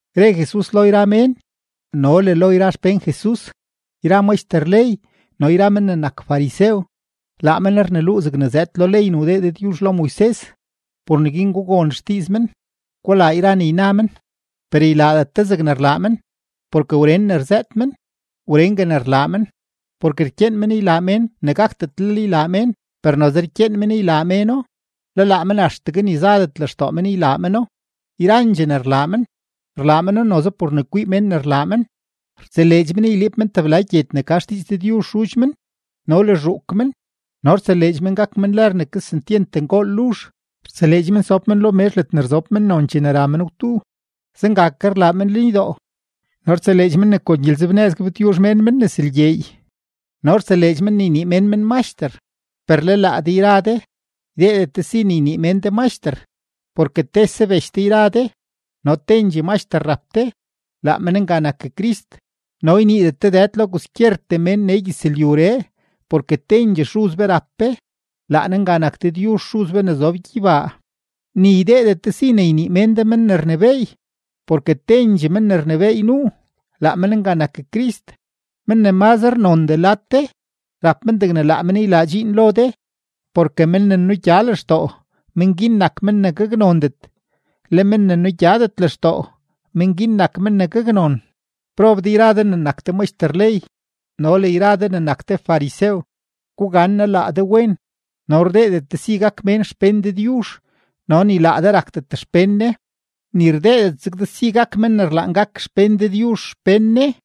Re Jesus lo yra mén no le lo yra xpén Jesus: ―Yra maxter ley no yra men ne nak farisew, laa men rneluu zegne zëëd lo ley ne wdee Dëdyuzh lo Moises. Por neguin gugon xdiiz men; gulaa yra ne yna men; per ylaadet de zeg rlaa men, porke wren ne rzëët men wrengue ne rlaa men. Porke rkyeen men ylaa mén ne gakdetlel ylaa mén, per noze rkyeen men ylaa méno; le laa men axtegue ni zadet lextoo men ylaa meno. Yrandxee ne rlaa men, rlaa meno noze por ne kwii mén ne rlaa men. Rtseleedx men yliib men tebla gyed ne ka xdiiz Dëdyuzh xudx men no le zhuuk men no rtseleedx men gak men lër ne kesentyent ngool luzh. Rtseleedx men sob men lo mezh ledne rzob mennon chene ra men gwdu; zenga ke rlaa men lenydoo. No rtseleedx men ne kon gyelenzebnëz gabtyuzh mén men nes lgyeey no rtseleedx men ne ynii mén men maxter. ’Per le laa de yra de, ydeedet de si ne ynii mén de maxter, porke tese bech de yra de, no tendxee Maxter rap de, laa men nga nak Crist. No yniidet de dëd lo kwaskyertee mén nee gyëzlyuree, porke tendxee Xuz be rap be, laa Ne nga nak Dëdyuzh Xuz be ne zob gyeybaa. Ni ydeedet de si ne ynii mén de men ne rnebééy porke tendxee men ne rnebééy nuu, laa men nga nak Crist. Men ne mazre nondee lad de, rap men degne laa men ylaa dxiin lo de. Porke men ne nugya lextoo, men guin nak men ne gaknondet; le men ne nugyadet lextoo, men guin nak men ne gaknon. ’¡Prob de yra de ne nak de maxter ley no le yra de ne nak de farisew, gugannaa laa de wen!, no rdeedet de si gak mén xpén Dëdyuzh, no ni laa de rakdet xpén Ne, ni rdeedet zeg de si ne gak mén ne rlaan gak xpén Dëdyuzh xpén Ne.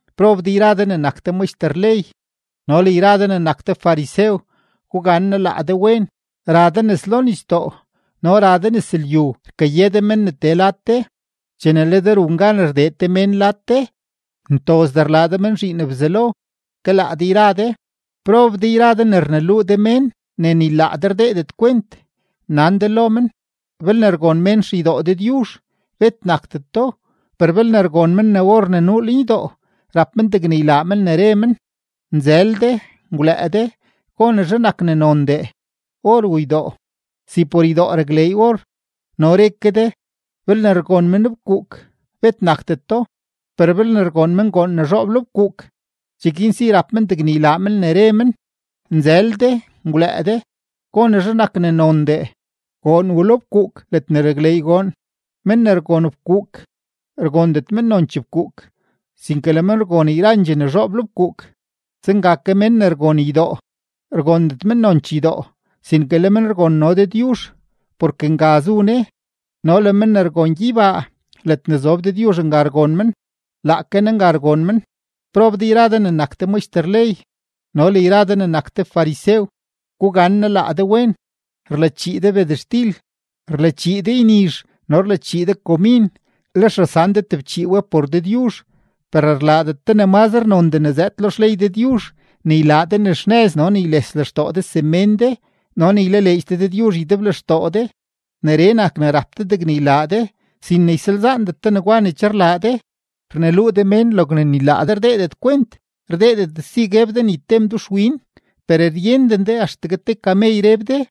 ’¡Prob de yra de ne nak de maxter ley no le yra de ne nak de farisew, gugannaa laa de wen! Ra de nes lo nisdoo no ra de nes lyu rkaye de mén ne tee lad de. Chene le de run gan ne rdee te mén lad de, ntozdee rlaa de men zhiin Bzelo ke laa de yra de. ’¡Prob de yra de ne rneluu de mén ne ni laa de rdeedet kwent! Nan de lo men: “Belne rgon mén xeydoo Dëdyuzh, bet nakdeto; per belne rgon men ne or ne nuu lenydoo, rap men degne ylaa men ne re men.” ¡Nzël de! ¡Ngwlëë de! ¿Gonezhe nak ne nondee: or u ydoo? Si por ydoo rakleey or. No re ke de: “Belne rgon mén fkuuk, bet nakdeto; per belne rgon men goon ne zhoob lo fkuuk, cheguin si rap men degne ylaa men ne re men.” ¡Nzël de! ¡Ngwlëë de! ¿Gonezhe nak ne nondee: goon u lo fkuuk ledne rakleey goon? Mén ne rgon fkuuk, rgondet men nonchee fkuuk, sinke le men rgon yrandxee ne zhoob lo fkuuk; zenga ke mén ne rgon ydoo, rgondet men nonchee ydoo, sinke le men rgon no Dëdyuzh, porke nga zu Ne. No le mén ne rgon gyeybaa, ledne zob Dëdyuzh nga rgon men, laake Ne nga rgon men. ’¡Prob de yra de ne nak de maxter ley no le yra de ne nak de farisew, gugannaa laa de wen! Rlachii de bedextil, rlachii de ynizh no rlachii de komin, lex rasan de tebchii we por Dëdyuzh, per rlaadet de ne mazre nondee ne zëëd lo xley Dëdyuzh ne ylaa de ne xnëz no ne yles lextoo de semén de no ne ylaleedx de Dëdyuzh ydeblextoo de. Neree nak ne rap de degne ylaa de, sin ne ysalzaandet de negwa ne che rlaa de. Rneluu de mén logne ni laa de rdeedet kwent, rdeedet de si gueb de ni te mduxwin per ryenden de ne axtegue te kamey reb de.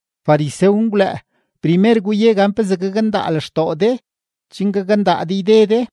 Farisew ngwlëë: primer guye gan pezee gakndaa lextoo de chen gakndaa de yde de.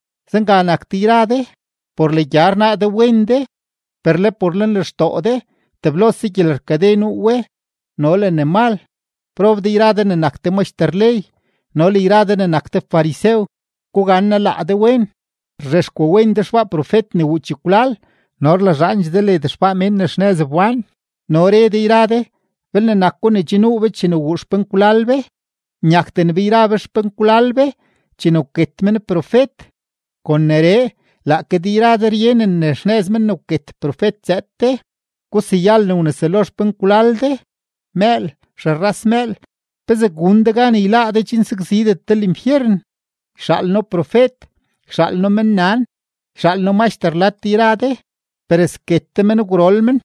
Zenga nak de yra de; por legya rnaa de wen de, per le por lenlextoo de teblose gyelerkade nuu we no le ne mal. ’¡Prob de yra de ne nak de maxter ley no le yra de ne nak de farisew, gugannaa laa de wen! Rzhexkwawen de xbaa profet ne wuu chekwlal no rlazhaandxee de led xbaa mén ne xnëz wbán, no re de yra de: “Belne nako ne che nuu be chene wuu xpenkwlal be, nyakden be yra be xpenkwlal be chene wket men profet.” Kon neree, laake de yra de ryenen ne xnëz men ne wket profet zëëd de. ¡Guseyal ne wneselo xpenkwlal de! ’¡Mëël! ¡Xerras mëël! ¿Pezee gun de gan yláá de chen sakzidet de linfyeren? Yxaal noo profet, yxaal noo mennan, yxaal noo maxter lad de yra de, per sket de men gwrol men,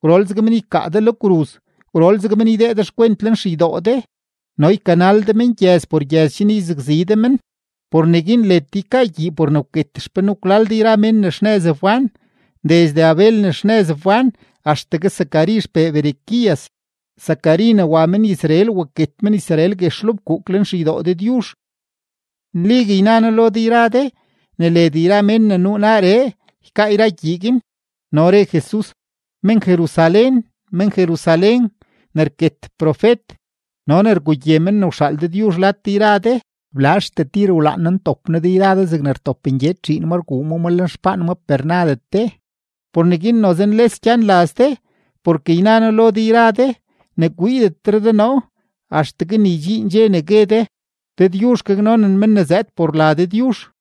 gwrol zeg men ykaa de lo kruz, gwrol zeg men ydee de xkwent lenxeydoo de, no ykanal de men gyëz por gyëz chen yzakzi de men. Por neguin led de ykaa gyii por ne wket xpenkwlal de yra mén ne xnëz wbán, desde Abel ne xnëz wbán axtegue Zacari xpee Berequías, Zacari ne wa men-Israel waket men-Israel guex lo fkuuk lenxeydoo Dëdyuzh. Nligue yna noo lo de yra de ne led yra mén ne nuu naaree ykaa yra gyii guin. No re Jesus: ―¡Men-Jerusalén, men-Jerusalén, ne rket profet no ne rgugye men ne wxaal Dëdyuzh lad de yra de! ¡Blazhtee tir wlaan noo ntop noo de yra de zegne rtop ngyed zhiin ngyed rguu ma ma lenxpaan maa, per nadet de! Por neguin noze nles gyan laz de. Porke yna noo lo de yra de, ne kwiidetre de noo axtegue ne ydxiin dxe ne gue de: “Dëdyuzh gaknonen men ne zëëd por la Dëdyuzh.”